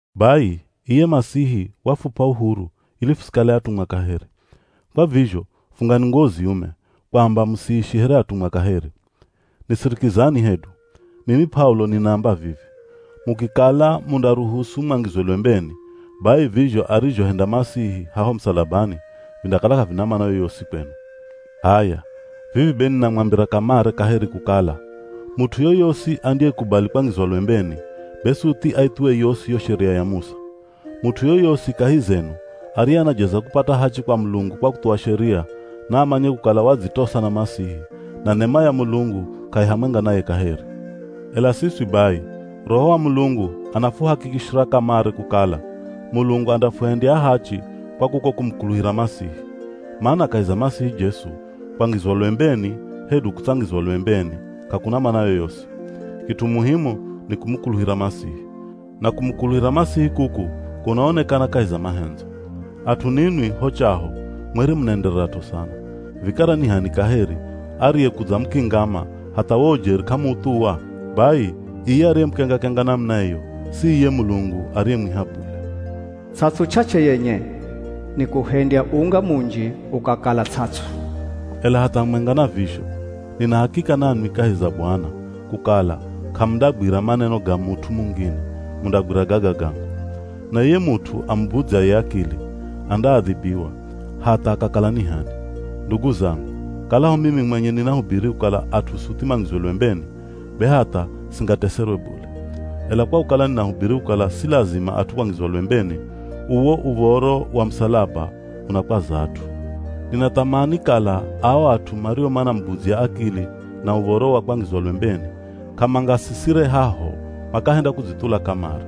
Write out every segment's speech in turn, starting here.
Bai, iye Masihi wafup'a uhuru ili fusikale atumwa kaheri. Kwa vizho fungani nguwo ziume, kwamba musiishi here atumwa kaheri. Nisirikizani hedu! Mimi P'aulo, ninaamba vivi: mukikala mundaruhusu mwangizwe lwembeni, bai vizho arizhohenda Masihi haho musalabani, vindakala k'avina mana yoyosi kwenu. H'aya, vivi be ninamwambira kamare kaheri kukala, mut'u yoyosi andiyekubali kwangizwa lwembeni, be suthi aithuwe yosi yo Sheria ya Musa. Mut'u yoyosi kahi zenu ariye anajeza kupata hachi kwa Mulungu kwa kuthuwa Sheria, naamanye kukala wadzitosa na Masihi, na nema ya Mulungu k'ai hamwenga naye kaheri. Ela siswi bai, Roho wa Mulungu anafuhakikishira kamare kukala, Mulungu andafuhendya ahachi kwa kuko kumukuluhira Masihi. Mana kahi za Masihi Jesu, kwangizwa lwembeni hedu kutsangizwa lwembeni, k'akuna mana yoyosi. Kit'u muhimu ni kumukuluhira Masihi. Na kumukuluhira Masihi kuku kunaonekana kahi za mahendzo. At'u ninwi ho chaho mwere munaendererat'o sana. Vikara ni h'ani kaheri ariyekudzamukingama hatha wo ujeri k'amuuthuwa? Bai iye ariyemukenga-kenga namuna iyo, si iye Mulungu ariyemwiha bule. Ts'ats'u ch'ach'e yenye nikuhendya unga munji ukakala ts'ats'u. Ela hatha hamwenga na vizho, nina hakika nanwi kahi za Bwana kukala k'amundagwira maneno ga mut'u mungine, mundagwira gaga gangu. Na iye mut'u amubudzyaye akili, andaadhibiwa, hatha akakala ni h'ani. Ndugu zangu, kalaho mimi mwenye ninahubiri kukala at'u suthi mangizwe lwembeni, be hatha singateserwe bule. Ela kwa kukala ninahubiri kukala si lazima at'u kwangizwa lwembeni, uwo uv̱oro wa musalaba unakwaza at'u. Ninathamani kala ao at'u mario manamubudzya akili na uv̱oro wa kwangizwa lwembeni, k'amangasisire haho, makahenda kudzithula kamare!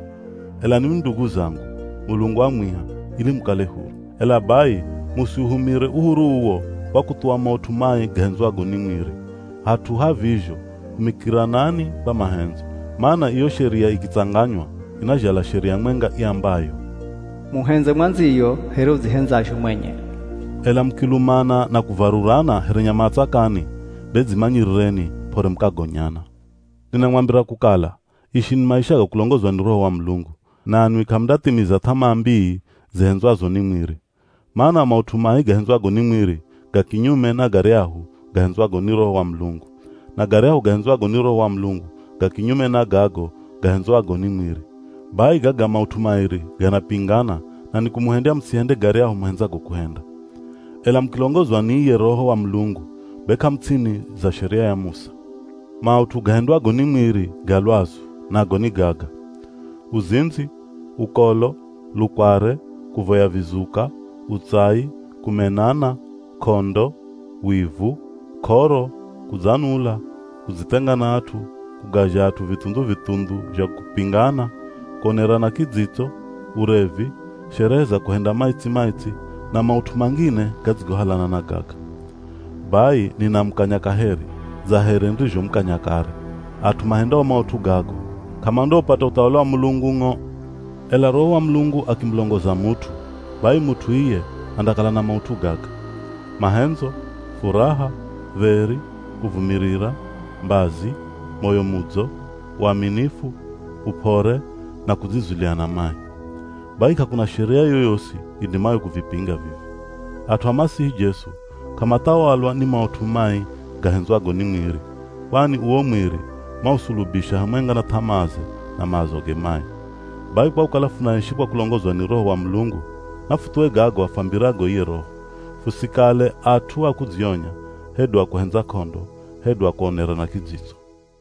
Ela ninwi ndugu zangu, Mulungu wamwiha ili mukale huru. Ela bai, musiuhumire uhuru uwo kwa kuthuwa maut'u mai gahendzwago ni mwiri, hat'u ha vizho humikiranani kwa mahendzo. Mana iyo Sheria ikitsanganywa inazhala sheria mwenga iambayo, “Muhendze mwandziyo here udzihendzazho mwenye.” Ela mukilumana na kuvarurana here nyama a tsakani, be dzimanyirireni p'ore mukagonyana. Ninamwambira kukala, ishini maisha ga kulongozwa ni Roho wa Mulungu, nanwi k'amundathimiza th'amaa mbii zihendzwazo ni mwiri. Mana maut'u mai gahendzwago ni mwiri, ga kinyume na garyahu gahendzwago ni Roho wa Mulungu, na garyahu gahendzwago ni Roho wa Mulungu, ga kinyume na gago gahendzwago ni mwiri. Bai gaga maut'u mairi ganapingana na nikumuhendya musihende garyahu muhendzago kuhenda. Ela mukilongozwa ni iye Roho wa Mulungu, be k'amu ts'ini za Sheria ya Musa. Maut'u gahendwago ni mwiri ga lwazu, nago ni gaga: Uzindzi, ukolo, lukware, kuvoya vizuka, utsai, kumenana, k'ondo, wivu, k'oro, kudzanula, kudzithenga na at'u, kugazha at'u vithundhu-vithundhu zha kupingana, kuonerana kidzitso, urevi, sherehe za kuhenda maitsi-maitsi, na maut'u mangine gadzigohalana na gaga. Bai ninamukanya kaheri, dza here nirizhomukanya kare, at'u mahendao maut'u gago, k'amandaupata uthawali wa Mulungu ng'o. Ela Roho wa Mulungu akimulongoza mut'u, bai mut'u iye andakala na maut'u gaga: Mahendzo, furaha, dheri, kuvumirira, mbazi, moyo mudzo, uaminifu, up'ore, na kudzizulia na mai. Bai k'akuna sheria yoyosi idimayo kuvipinga vivi. At'u a Masihi Jesu, k'amathawalwa ni maut'u mai gahendzwago ni mwiri. Kwani uwo mwiri mausulubisha hamwenga na th'amaaze, na maazoge mai. Bai kwa kukala funaishi kwa kulongozwa ni Roho wa Mulungu, nafuthuwe gago afwambirago iye Roho. Fusikale at'u a kudzionya, hedu a kuhendza k'ondo, hedu a kuonerana kidzitso.